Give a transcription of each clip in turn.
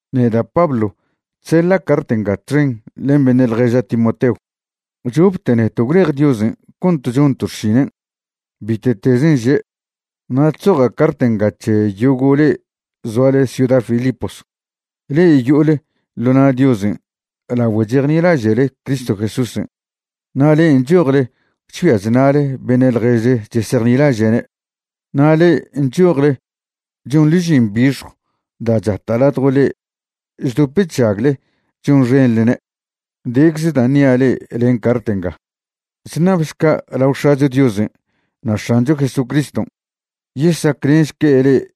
Neda' Pablo chseḻa' cart nga txen len beṉe' ḻježa' Timoteo. Chopte neto' gwlej Diosen' cont chonto' xšinen', bite'tezen' že'. Na' chzoja' cart nga c̱he yogo' le'e zoale ciuda Filipos, le'e yo'ole ḻo na' Diosen' lagüe chejnilaže'le Cristo Jesúsen'. Na' le'e nchojle chgüia chṉa'le beṉe' ḻježle chesejnilaže'ne', na' le'e nchojle chonḻe žin bixjw da' chata' ladjo le'e chdop chžagle chonxenḻne', decze da' ṉia' le'e len cart nga. Chṉabšca' lao X̱acho Diosen' na' X̱ancho Jesucriston' yesaclenšque' le'e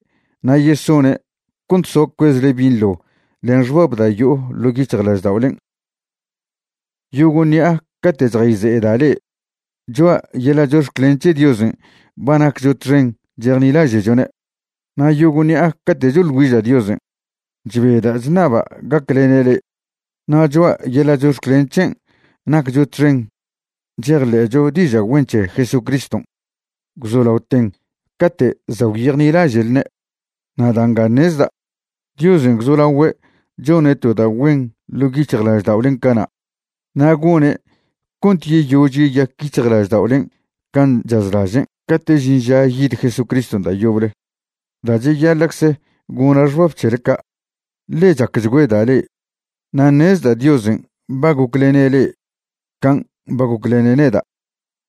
na' yesone' cont soa cuezle binḻo len xbab da' yo'o ḻo' yic̱hjlažda'olen'. Yogo' ṉi'a cate' chjayze'eda' le'e, choa' yeḻa' chox̱clen c̱he Diosen' ba naccho txen chejnilaže'chone'. Na' yogo' ṉi'a cate' choḻ güiža' Diosen', chbeda' chṉaba' gaclene' le'e. Na' choa' yeḻa' chox̱clen c̱hen' naccho txen chejḻe'cho diža' güen c̱he Jesucriston', gwzolaoten cate' za' gwyejnilaže'lne'. Na' da' nga ṉezda', Diosen' gwzolagüe' chone' to da' güen ḻo' yic̱hjlažda'olen' cana', na' gone' cont yeyož yeyac yic̱hjlažda'olen' can' chazlažen' cate' žin ža yid Jesucriston' da' yoble. Da' cheyaḻa'cze gona' xbab c̱hele ca', ḻe chacchgüeda' le'e. Na' ṉezda' Diosen' ba goclene' le'e can' ba goclene' neda'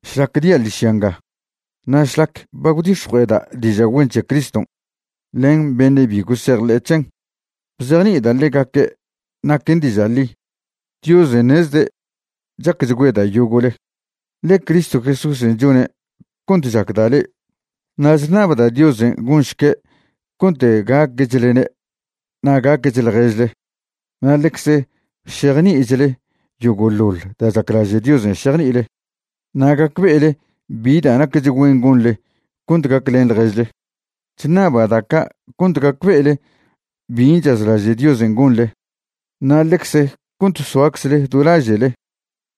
šlac dia' ḻižya nga, na' šlac ba gwdix̱jue'eda' diža' güen c̱he Criston' len beṉe' bi gosejḻe'e c̱hen, bzejni'ida' ḻegaque' naquen diža' ḻi. Diosen' ṉezde' chacchgüeda' yogo'le, ḻe Cristo Jesúsen' chone' cont chacda' le'e. Na' chṉabda' Diosen' gonšque' cont gaquechlne' na' gaqueche ḻježle na' ḻecze šejni'ichle yogo'ḻoḻ da' chaclaže' Diosen' šejni'ile na' gacbe'ele bi da' naquech güen gonḻe cont gaclen ḻježle. Chṉaba' da' ca' cont gacbe'ele bin' chazlaže' Diosen' gonḻe, na' ḻecze cont soaczle do laže'le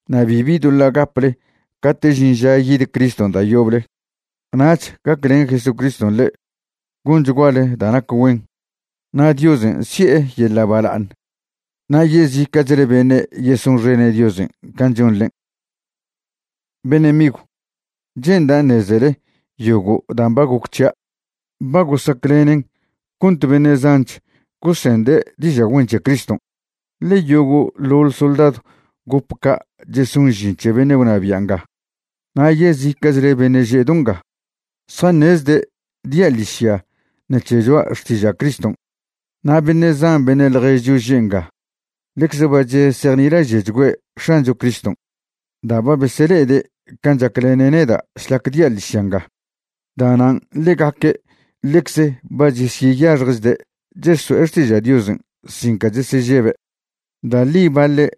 na' bibi doḻa' gaple cate' žin ža yid Criston' da' yoble. Nach gaclen Jesucriston' le'e gonchguale da' nac güen, na' Diosen' si'e yeḻa' bala'aṉ na' yezica'chle beṉe' yesonxene' Diosen' can' chonḻen'. Beṉe' migw, che'nda' ṉezele yogo' dan' ba goc c̱hia' ba gosaclenen cont beṉe' zanch gosende' diža' güen c̱he Criston'. Ḻe yogo'ḻoḻ soldadw gop ca' cheson žin c̱he beṉe' gwnabia' nga, na' yezica'chle beṉe' že' do nga zjaṉezde' dia' ḻižya ṉec̱he choa' xtiža' Criston'. Na' beṉe' zan beṉe' ḻježcho že' nga ḻecze ba chesejnilaže'chgüe' X̱ancho Criston' da' ba besele'ede' can' chaclene' neda' šlac dia' ḻižya nga. Da'nan' ḻegaque' ḻecze ba chesyeyaxjchde' cheso'e xtiža' Diosen' sin ca chesežebe'. Da' ḻi baḻe'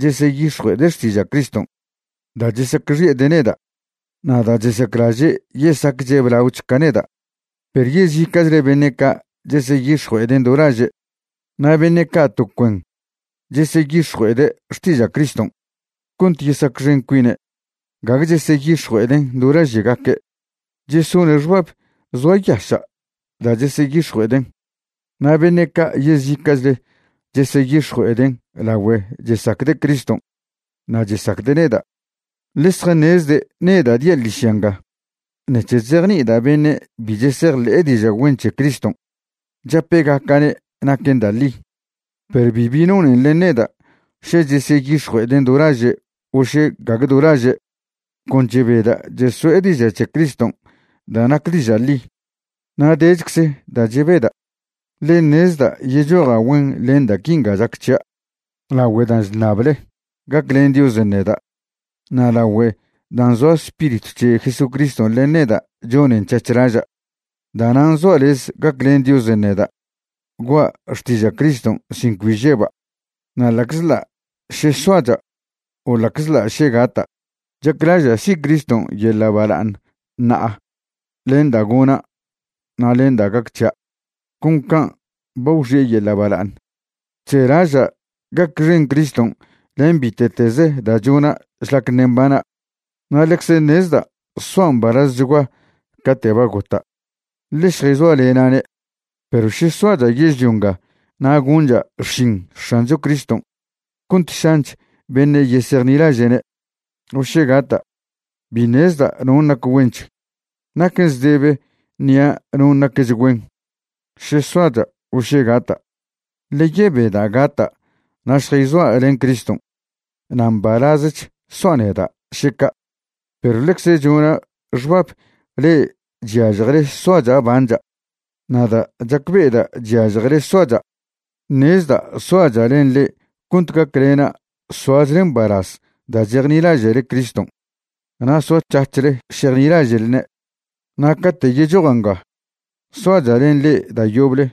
cheseyix̱jue'ede' xtiža' Criston' da' chesacxi'ede' neda' na' da' chesaclaže' yesacche' blaoch ca neda', perw yezica'chle beṉe' ca' cheseyix̱jue'eden' do laže'. Na' beṉe' ca' to cuen cheseyix̱jue'ede' xtiža' Criston' cont yesacxen cuine', gague cheseyix̱jue'eden' do laže'gaque'. Chesone' xbab zoayaša' da' cheseyix̱jue'eden'. Na' beṉe' ca' yezica'chle cheseyix̱jue'eden' lagüe chesacde' Criston' na' chesacde' neda', ḻe zjaṉezde' neda' dia' ḻižya nga ṉec̱he chzejni'ida' beṉe' bi chesejḻe'e diža' güen c̱he Criston', chape'gaca'ne' naquen da' ḻi. Perw bibi nonen len neda' še cheseyix̱jue'eden' do laže' o še gague do laže', con chebeda' cheso'e diža' c̱he Criston' da' nac diža' ḻi. Na' dechcze da' chebeda', ḻe ṉezda' yechoja' güen len da' quinga chac c̱hia' lagüe dan' chṉable gaclen Diosen' neda' na' lagüe dan' zoa Spiritw c̱he Jesucriston' len neda' chonen c̱hac̱h laža'. Da'nan' zoa' lez gaclen Diosen' neda' gua' xtiža' Criston' sin cbi žeba'. Na' ḻa'czḻa' še soacha' o ḻa'czḻa' še gata', chaclaža' si' Criston' yeḻa' bala'aṉ ṉa'a len da' gona' na' len da' gac c̱hia' con can' ba gwxi'e yeḻa' bala'aṉ. Chzelaža' gacxen Criston' len bite'tez da' chona' šlac ṉe' mbana', na' ḻecze ṉezda' soa' mbalazchgua cate' ba gota', ḻe šjayzoalena'ne'. Perw še soacha' yežlio nga na' goncha' xšin X̱ancho Criston' cont šanch beṉe' yesejnilaže'ne', o še gata', bi ṉezda' non' nac güench. Naquen zdebe ṉia' non' naquech güen, še soacha' o še gata', ḻe yebeda' gata' na' šjayzoa' len Criston', na' mbalazech soa' neda', še ca'. Perw ḻecze chona' xbab le'e chyažjele soacha' bancha'. Na' da' chacbe'eda' chyažjele soacha', ṉezda' soacha' len le'e cont gaclena' soachle mbalaz da' chejnilaže'le Criston' na' soac̱hac̱hle šejnilaže'lne'. Na' cate' yechoja' nga soacha' len le'e da' yoble,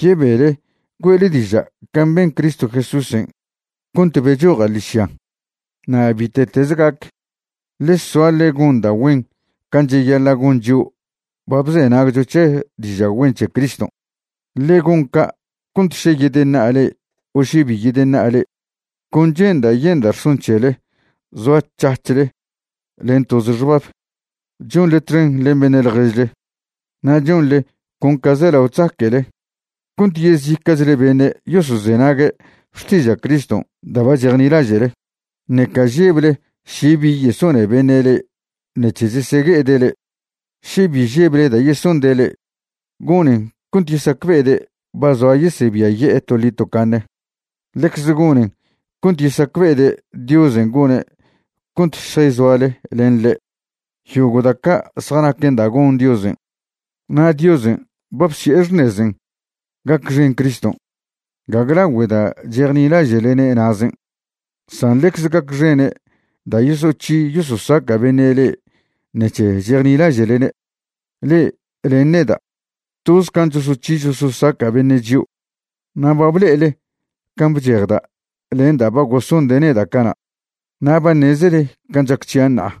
yebele güe'le diža' can' ben Cristo Jesúsen' cont bechoja' ḻižyan'. Na' bite'teze gac, ḻe soa ḻe gon da' güen can' cheyaḻa' gon chio' ba bzenagcho c̱he diža' güen c̱he Criston'. Ḻe gon ca' cont še yedeṉa'a le'e o še bi yedeṉa'a le'e, con che'nda' yenda' rson c̱hele zoac̱hac̱hle len toze xbab, chonḻe txen len beṉe' ḻježle, na' chonḻe con ca zelao chzaque'le cont yezica'chle beṉe' yosozenague' xtiža' Criston' da' ba chejnilaže'le, ṉeca žeble še bi yesone beṉe' le'e ṉec̱he chesegue'ede' le'e. Še bi žeble da' yesonde' le'e, gonen cont yesacbe'ede' ba zoa yesebiaye'e toḻi tocaṉe; ḻecze gonen cont yesacbe'ede' Diosen' gone' cont šjayzoale len ḻe'. Yogo' da' ca' zjanaquen da' gon Diosen'. Na' Diosen' ba bsi'e xṉezen' gacxen Criston', gague lagüe da' chejnilaže'lene' na'zen', san ḻecze gacxene' da' yosoc̱hi yososaca' beṉe' le'e ṉec̱he chejnilaže'lene'. Le'e len neda', toz can' chosoc̱hi chososaca' beṉe' chio'; na' ba ble'ele can' bchejda' len da' ba gosonde' neda' cana', na' ba ṉezele can' chac c̱hia' ṉa'a.